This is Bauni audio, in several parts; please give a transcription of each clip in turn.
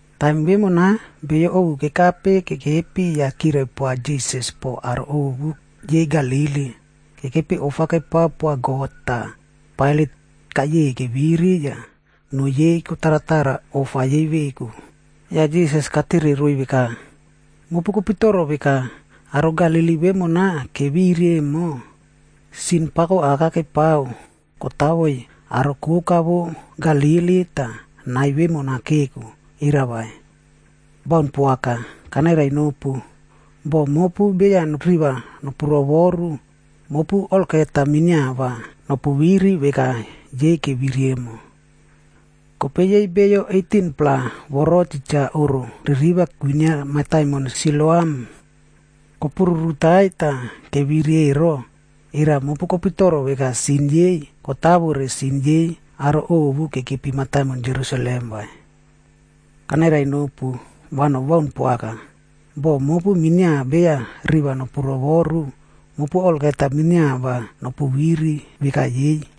Taim vemona, beyo ovu kekape kekepi yah kirai poa Jisas po aro ovu yei Galili, kekepi ofa kepao poa God tah Pailat kayeiy keviri yah noo yei kotarata ofa yei veku. Yah Jisas katere roiy veka, “Mopu kopitoro veka, aro Galili vemona keviri emo, sin pako aka kepao kotavoiy aro koka vo Galili tah nai vemona keko, era vai? Baun poaka! Kanairai nopu, boh mopu beya riva nopu rovoru, mopu olgeta minia va nopu viri veka yei keviri emo. Kope yei beyo 18-pla voro titja oꞌro ririva kwinia mataimon Siloam kopururutaiy tah keviri ero, era mopu kopitoro veka sin yei kotavore sin yei aro ovu kekepi mataimon Jerusalem vai? Kanairai nopu, va nobaun poaka. Boh mopu minia beya riva nopu rovoru, mopu olgeta minia va nopu viri veka yei.”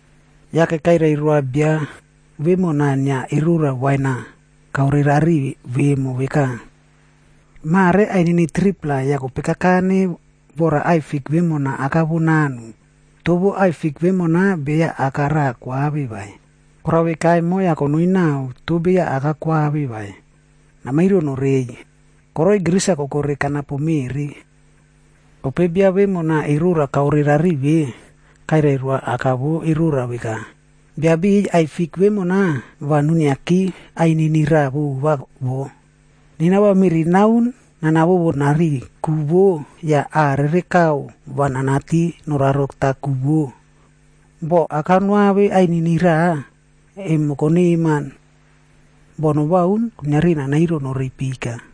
Yake kairai roa bia vemona inia erora wain-a kaorerari vemo veka, ‘Mare ainini 3-pla yah kope kakane vora aꞌai fik vemona aka vo nanu, toh vo aꞌai fik vemona beya aka raꞌa koave vai. Korao veka emo, yah konoi nao toh beya aka koave vai, namairo norei. Koroi gris-a koko kanapo reu meꞌri.’ “Kope bia vemona erora kaore rariꞌi ve, kairai roa aka vo erora veka, ‘Biabiꞌiy, aꞌai fik vemona va nuiniaki ainini raꞌa vova wo. Nena va meꞌri naun nana vovo nari ku vo yah aꞌa rere kau va nanati norarotao ku vo. Boh aka noave ainini raꞌa, emo koneman. Boh nobaun, kuiniari namairo norei pika.’”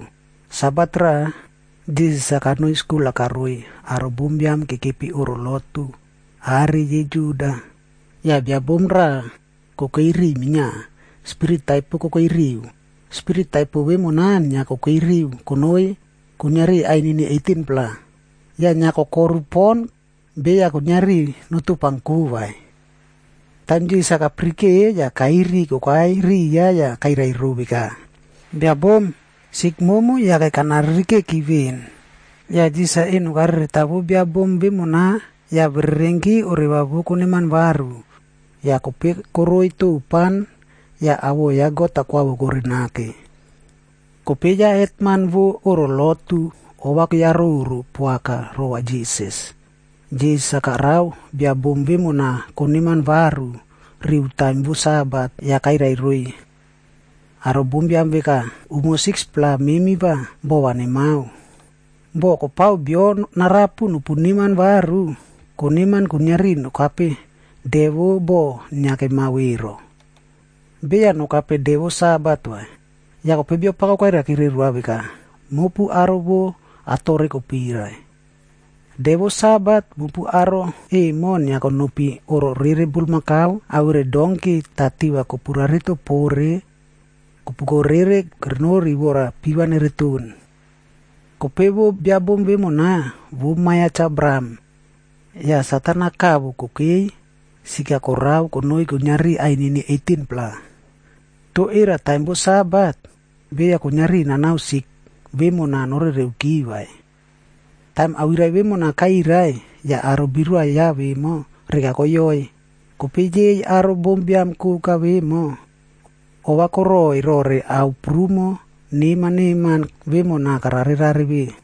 Sabata raꞌa, Jisas kanoi skul-a karoiy aro bombiam kekepi oꞌro lotu are yei Juda. Yah biabom raꞌa kokei riꞌiy minia, spirit taipo kokei riu. Spirit taipo vemona inia kokei riu konoi kuiniari ainini 18-pla. Yah inia kokoru pon, beya kuiniari notopanko vai. Taim Jisas kapirike, ya kairi kokai riya yah kairai ro veka, “Bia bom, sik momu yake kana ririkeki veꞌen.” Yah Jisas eno karereta vo biabom vemona yah bererenki oreva vo koneman varu, yah kope koroi topan yah awoꞌo ya God koavoko nake. Kope ya hetman vo oꞌro lotu ova keyaroro poaka rova Jisas. Jisas-a karao bia bom vemona koneman varu riu taim vo Sabat. Yah kairai roiy aro bombiam veka, “Umo 6-pla memi va bova nemao. Boh kopao bio narapu nopu neman varu, koneman kuiniari nokape de vo boꞌo inia kemao ero. Beya nokape de vo Sabat vai.” Yah kope Biapako kairaikire roa veka, “Mopu aro vo atore kopirai! De vo Sabat, mopu aro emo inia konopi oꞌro rere bulmakau awere donki tah tiva kopu rarito pore yah kopuko rere kerenori vora piva nereton. Kope vo biabom vemona, vo ma ya Cha Abraham. Yah Satan-a kavo kokei sik-a korao konoi kuiniari ainini 18-pla. Toh era taim vo Sabat, beya kuiniari nanao sik vemona norereuki vai?” Taim awirai vemona kairai, yah aro birua ya vemo, reka koyoiy. Kope yei aro bombiam koka vemo, ova koroiy rore ao prumo neman neman vemona kare rare ve.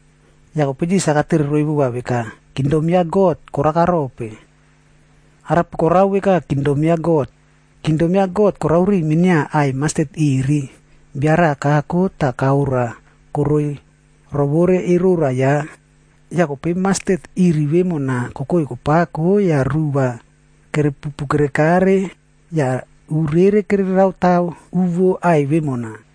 Yah kope Jisas-a katere roiy veka, “Kingdom ya God, koraka rope? Arape korao veka Kingdom ya God? Kingdom ya God, korao riu minia aꞌai mastet iri,b bia raꞌa kako tah kaora koroi rovore erora ya. Yah kope mastet iri vemona kokoi kapako yah ruꞌu va kerepupu kerekare yah u rere kereraota u vo aꞌai vemona.”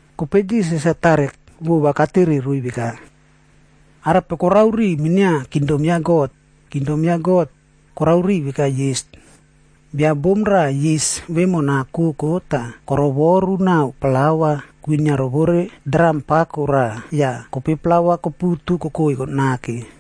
Kope Jisas-a tare vova katere roiy veka, “Ao arape korao riu minia kingdom ya God? Kingdom ya God, korao veka yis. Bia bom raꞌa yis vemona koko tah korovoru naꞌao plaua kwinia rovore dram pako raꞌac yah kope plaua koputu kokoi nake.”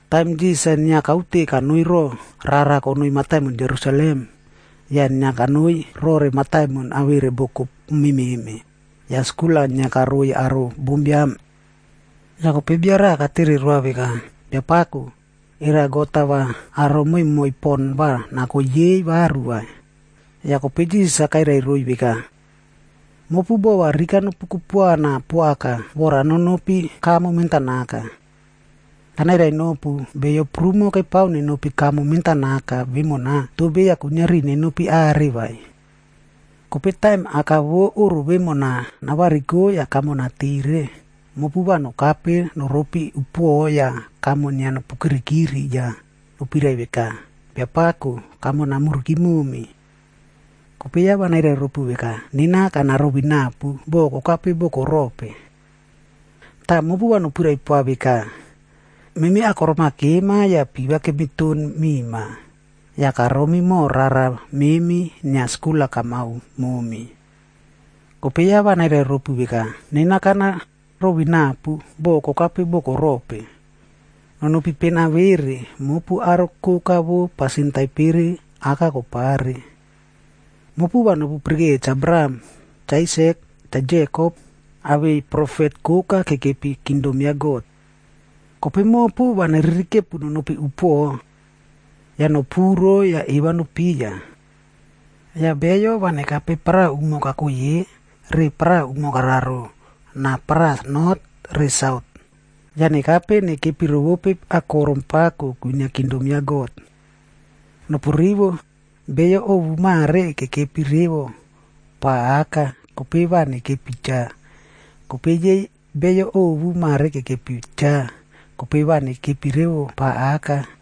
Taim Jisas inia kaute kanoi roꞌo rara konoi mataimon Jerusalem, yah inia kanoi rore mataimon awere boko mememe, yah skul-a inia karoiy aro bombiam. Yah kope bia raꞌa katere roa veka, “Biapako, era God-a va aro moimoi pon va nako yei varu vai?” Yah kope Jisas-a kairai roiy veka, “Mopu bova rika nopu kupuana poaka, vora nonopi kamo mentanaka. Kanairai nopu, beyo prumo kepao nenopi kamo mentanaka vemona, toh beya kuiniari nenopi are vai. Kope taim aka vo oꞌro vemona navariko yah kamo natire, mopu va nokape noropi upuoꞌo yah kamo inia nopu kirikiri yah nopirai veka, ‘Biapako, kamo namuriki momi.’ Kope ya va nairai ropu veka, ‘Nena kana rovinapu, bo kokape boko rope.’ “Tah mopu va nopirai poa veka, ‘Memi akorom-a kema yah piva kemiton mima, yah karomi moho rara memi inia skul-a kamao momi.’ “Kope ya va nairai ropu veka, ‘Nena kana ruvinapu, bo kokape boko rope. Nonopi pena vere, mopu aro koka vo pasin taipere aka kopare.’ “Mopu va nopu pirikeiya Cha Abraham, Cha Aisak, Cha Jekopd awei profet koka kekepi kingdom ya God. Kope mopu, va neririkepu nonopi upuoꞌo. Yah nopuro tah eva nopuiya. Yah beyo va nekape paraꞌa umo kakoi ye, re paraꞌa vo umo kararo, na paraꞌa not re saut. Yah nekape nekepi rovope akorom pako kwinia kingdom ya God. Nopu rivo, beyo ovu mare kekepi revo pa aka, kope va nekepi cha. Kope yei beyo ovu mare kekepi cha, kope va nekepi revo pa aka.”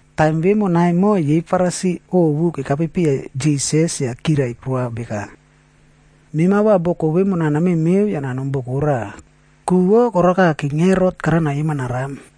Taim vemona emo, yei Farisi ovu kekape piya Jisas yah kirai poa veka, “Mema va boko vemona namemeo yah nanom boko raꞌa, ku vo koraka King Herot karao nayema naram.”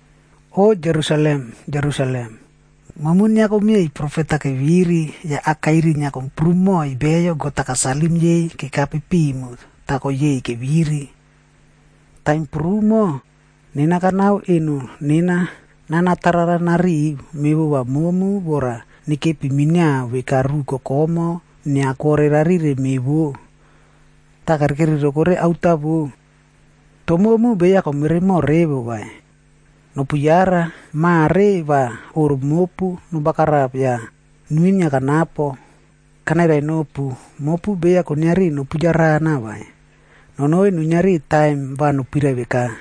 “O Jerusalem! Jerusalem! Momu inia komieiy profet-a keviri yah akairi inia komprum moiy beyo God-a kasalim yei kekape pimu tah koyeiy keviri. Taim prumo, nena kanao eno nena nana tarara nariꞌiy mevova momu vora nekepi minia veka ruꞌu kokomoꞌo inia kwore rarire me vo, tah kere kerirokore aota wo. Toh momu beya komeremo revo vai! Nopu yara! Mare va oꞌro mopu nobagarap yah nuinia kanapo. Kanairai nopu, mopu beya kuiniari nopu yarana vai, nonoi nuiniari taim va nopirai veka,